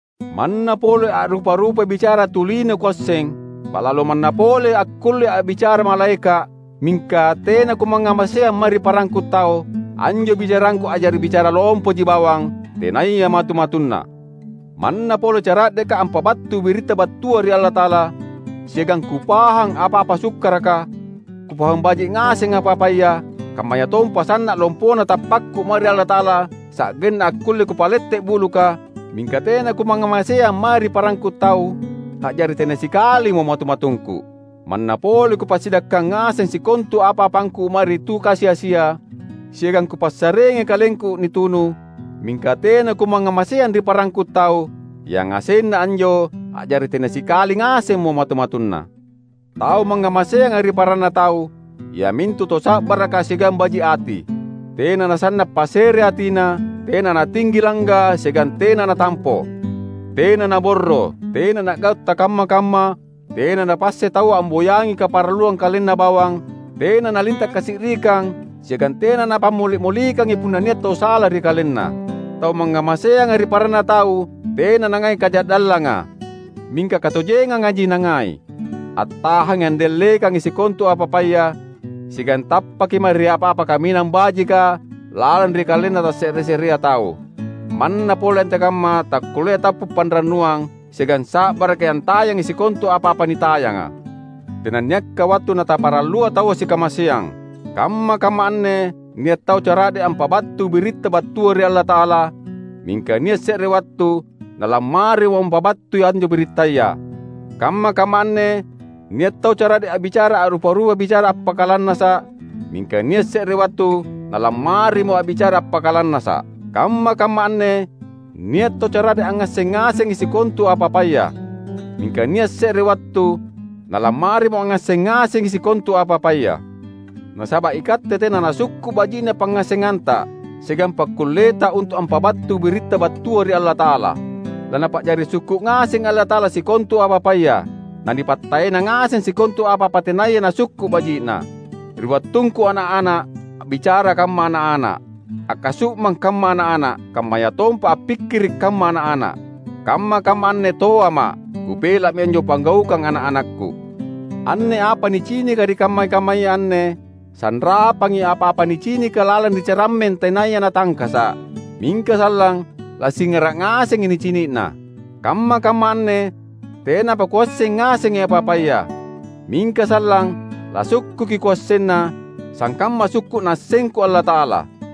Manna pole a’rupa-rupai bicara tu lino kuasseng, ba’lalo manna pole akkullea’ a’bicara malaeka’, mingka tena kumangngamaseang mae ri parangku tau, anjo bicarangku a’jari bicara lompoji bawang, tenaya matu-matunna. Manna pole cara’deka’ ampabattui biritta battua ri Allata’ala, siagang kupahang apa-apa sukkaraka, kupahang baji’ ngaseng apa-apaya, kammayatompa sanna’ lompona tappakku mae ri Allata’ala sa’genna akkulle kupalette’ buluka, mingka tena kumangngamaseang mae ri parangku tau, a’jari tena sikalimo matu-matungku! Manna pole kupassidakkang ngaseng sikontu apa-apangku mae ri tu kasi-asia, siagang kupassareangi kalengku nitunu, mingka tena kumangngamaseang ri parangku tau, yangasenna anjo a’jari tena sikali ngasemmo matu-matunna. Tau mangngamaseanga ri paranna tau, iamintu tau sa’baraka siagang baji’ ati. Tena nasanna’ pasereatina, tena natinggi langga siagang tena natampo. Tena naborro, tena na’gau’ takamma-kamma; tena napassai taua amboyangi kaparalluang kalenna bawang, tena nalinta’ kasi’rikang, siagang tena napammoli’-molikangi punna nia’ tau sala ri kalenna. Tau mangngamaseanga ri paranna tau tena nangai kaja’dallanga; mingka katojengangaji nangai. Attahangi andallekangi sikontu apa-apaya, siagang tappaki mae ri apa-apa kaminang bajika lalang ri kalenna tasse’re-se’rea tau; manna pole antekamma takkulleai tappu’ panrannuang siagang sa’baraki antayangi sikontu apa-apa nitayanga. Tenanniakka wattu nataparallua taua sikamaseang. Kamma-kamma anne nia’ tau cara’de’ ampabattui biritta battua ri Allata’ala, mingka nia’ se’re wattu nalammarimo ampabattui anjo birittaya. Kamma-kamma anne nia’ tau cara’de’ a’bicara a’rupa-rupa bicara appakalannasa’, mingka nia’ se’re wattu nalammarimo a’bicara appakalannasa’. Kamma-kamma anne nia’ tau cara’de’ angngasseng ngasengi sikontu apa-apaya, mingka nia’ se’re wattu nalammarimo angngasseng ngasengi sikontu apa-apaya. Nasaba’ ikatte tena nasukku’ baji’na pangngassenta siagang pakkulleta untu’ ampabattui biritta battua ri Allata’ala. LaNapa’jari sukku’ ngasengi Allata’ala sikontu apa-apaya, nanipattaena ngaseng sikontu apa-apa tenaya nasukku’ baji’na. Ri wattungku ana’-ana’, a’bicara kamma’ ana’-ana’, akkasu’mang kamma’ ana’-ana’, kammayatompa appikkiri’ kamma’ ana’-ana’. Kamma-kamma anne toama’; kupela’mi anjo panggaukang ana’-anakku. Anne apa nicinika ri kamma-kammaya anne, sanrapangi apa-apa nicinika lalang ri carammeng tenaya natangkasa’. Mingka sallang, lasingara’ ngasengi nicini’na. Kamma-kamma anne tenapa kuasseng ngasengi apa-apaya; mingka sallang lasukkuki kuassenna, sangkamma sukku’ Naassengku Allata’ala.